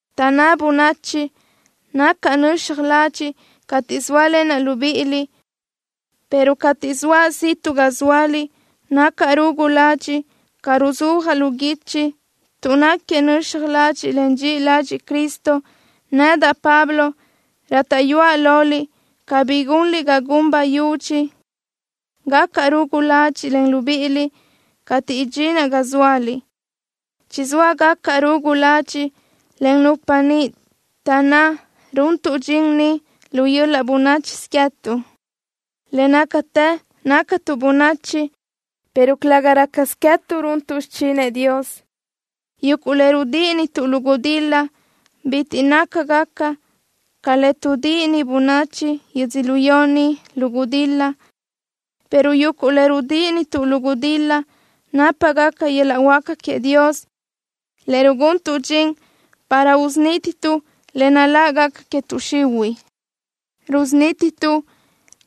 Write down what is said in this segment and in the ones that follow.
Taʼnná bönachi nacaʼ nöxaj ladxiʼ cateʼ zóalenaʼ libíʼiliʼ, pero cateʼ zoaʼ ziʼtuʼ ga zóaliʼ nacaʼ rugu ladxiʼ ca ruzúajaʼ lu guichi. Tuʼ náquiëʼ nöxaj ladxiʼ, en dxiʼi ladxiʼ Cristo, nedaʼ, Pablo, rátaʼyuaʼ loliʼ cabí gunliʼ ga gun bayudxi gacaʼ rugu ladxiʼ len libíʼiliʼ cateʼ idxinaʼ ga zóaliʼ. Chizóa gacaʼ rugu ladxiʼ len nupa niʼ taʼnná runtuʼ dxin ni lu yöl-laʼ bönáchisö queë́tuʼ. Le nácatë nácatuʼ bönachi, pero calëga rácasö queë́tuʼ runtuʼ xichinëʼ Dios. Yuguʼ le rudíʼinituʼ lu gudil-la, bitiʼ nácagaca ca le tuʼdíʼini bönachi yödzölió ni lu gudil-la, pero yuguʼ le rudíʼinituʼ lu gudil-la nápagaca yöl-laʼ huáca queëʼ Dios, le ruguntuʼ dxin para usunítituʼ le nál-lagaca que tuʼ xihuiʼ. Rusunítituʼ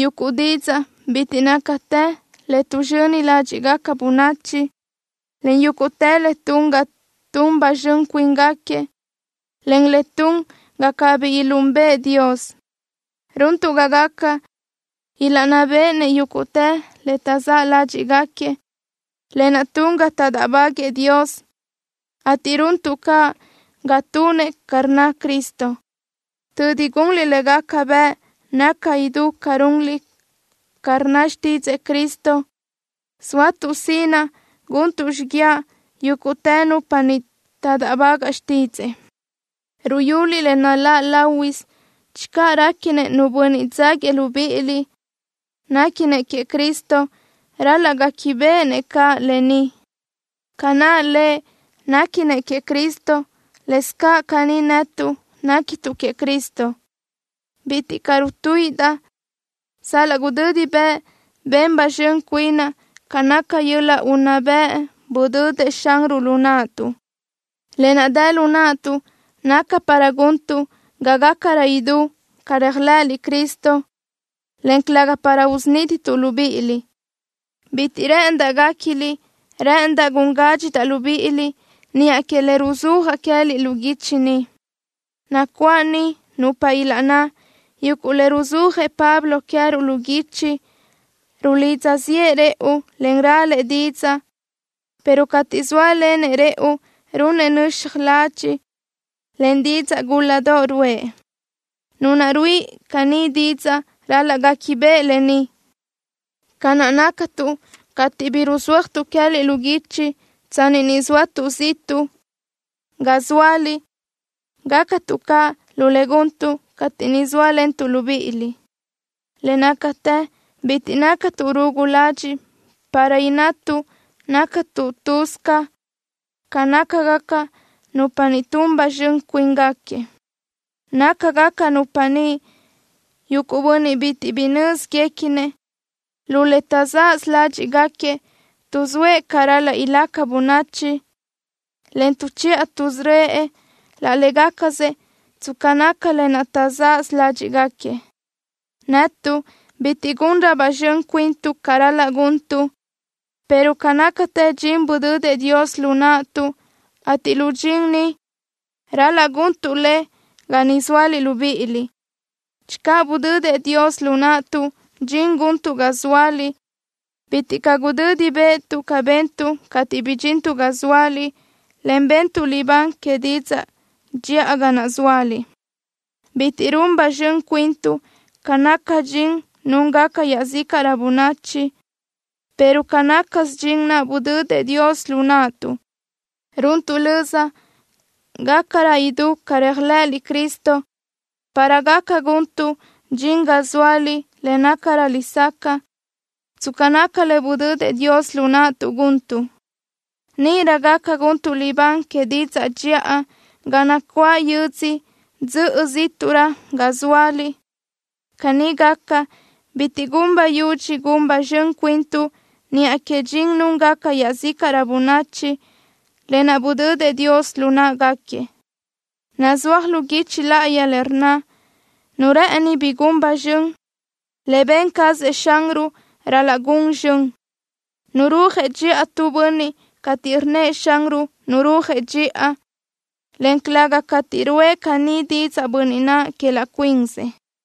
yuguʼ didzaʼ bitiʼ nácatë le tuʼzxöni ládxiʼgaca bönachi, en yúguʼtë le tun ga tun ba zxön cuínguequi, en le tun ga cabí ilunbëʼ Dios. Runtuʼ ga gaca ilaʼnná béʼenëʼ yúguʼtë le taʼzáʼ ládxiʼgaquiëʼ, lë naʼ tun ga taʼdáʼbaguëʼë Dios, ateʼ runtuʼ caʼ ga tunëʼ ca rnnëʼ Cristo. Tödi gunliʼ le gaca bëʼ naca idú ca runliʼ ca rnna xtídzëʼë Cristo, sóatuʼ sinaʼ guntuʼ xíguiaʼ yúguʼtë nupa niʼ taʼdáʼbagaʼ xtídzëʼë. Ruyuliʼ le naláʼ láhuisö. Channö réquinëʼ nu bönniʼ dzáguiëʼ libíʼiliʼ néquinëʼ queëʼ Cristo, ral-laʼ guéquibeʼenëʼ caʼ lë ni: Ca naʼ lëʼ néquinëʼ queëʼ Cristo, lëscaʼ caní netuʼ néquituʼ queëʼ Cristo. Bitiʼ caʼ rutuíʼidaʼ sal-laʼ gudödi bëʼ ben ba zxön cuinaʼ ca naca yöl-laʼ unná bëʼ budödëʼ Xanruʼ lu naʼtuʼ. Lë naʼ dë lu naʼtuʼ naca para guntuʼ ga gácarö idú ca réajlëʼëliʼ Cristo, en calëga para usunítituʼ libíʼiliʼ. Bitiʼ rë́ʼëndaʼ guéquiliʼ rë́ʼëndaʼ gun gádxidaʼ libíʼiliʼ niʼa que le ruzúajaʼ queë́liʼ lu guichi ni. Nacuáʼ niʼ nupa ilaʼnná: “Yuguʼ le ruzúajëʼ Pablo queë́ruʼ lu guichi, rulidza ziʼë rëʼu, en ralëʼ didzaʼ, pero cateʼ zóalenëʼ rëʼu runëʼ nöxaj ladxiʼ, en didzaʼ gúladoʼ ruʼë.” Nu naʼ ruíʼi caní didzaʼ ral-laʼ guéquibeʼe lë ni: Ca naʼ nácatuʼ cateʼ bi ruzúajtuʼ queë́liʼ lu guichi tsanni ni zóatuʼ ziʼtuʼ ga zóaliʼ, gácatuʼ caʼ lu le guntuʼ cateʼ niʼ sóalentuʼ libíʼiliʼ. Le nácatë bitiʼ nácatuʼ rugu ladxiʼ para innatuʼ nácatuʼ lëbi ca nácagaca nupa niʼ tun ba zxön cuínguequi. Nácagaca nupa niʼ yuguʼ bönniʼ bitiʼ bi nö́zguequinëʼ. Lu le taʼzaʼsö ládxiʼgaquiëʼ tuʼzóëʼ ca ral-laʼ ilaca bönachi, en tuʼchiʼa tuʼsörö́ëʼ laʼ légacasëʼ tsca naca lë naʼ taʼzaʼsö ládxiʼgaquiëʼ. Netuʼ bitiʼ gunrö ba zxön cuintuʼ ca ral-laʼ guntuʼ, pero ca nácatë dxin budödëʼ Dios lu naʼtuʼ, ateʼ lu dxin ni, ral-laʼ guntuʼ le ga niʼ zóaliʼ libíʼiliʼ. Channö budödëʼ Dios lu naʼtuʼ dxin guntuʼ ga zóaliʼ, bitiʼ caʼ gudödi bë́ʼëtuʼ ca bentuʼ cateʼ bidxintuʼ ga zóaliʼ, en bentuʼ libán que didzaʼ dxiʼa ga naʼ zóaliʼ. Bitiʼ run ba zxön cuintuʼ ca naca dxin núngaca iaʼzícaʼrö bönachi, pero ca nácasö dxin naʼ budödëʼ Dios lu naʼtuʼ. Runtuʼ löza gácarö idú ca réajlëʼëliʼ Cristo para gaca guntuʼ dxin ga zóaliʼ le nácarö lesacaʼ, tsca naca le budödëʼ Dios lu naʼtuʼ guntuʼ. Níʼirö gaca guntuʼ libán que didzaʼ dxiʼa ga nacuáʼ yödzö dzöʼö zíʼtuʼrö ga zóaliʼ. Caní gaca, bitiʼ gun bayudxi gun ba zxön cuintuʼ niʼa que dxin núngaca iaʼzícaʼrö bönachi, lë naʼ budödëʼ Dios lu në́ʼeguequi. Nazúaj lu guichi láʼayi le rnna: Nu rë́ʼëni bi gun zxön, le ben cazëʼ Xanruʼ ral-laʼ gun zxön. Nurúajëʼ dxiʼa tu bönniʼ cateʼ rnnëʼ Xanruʼ nurúajëʼ dxiʼa, en calëga cateʼ ruʼë caní didzaʼ bönniʼ naʼ que laʼ cuinsëʼ.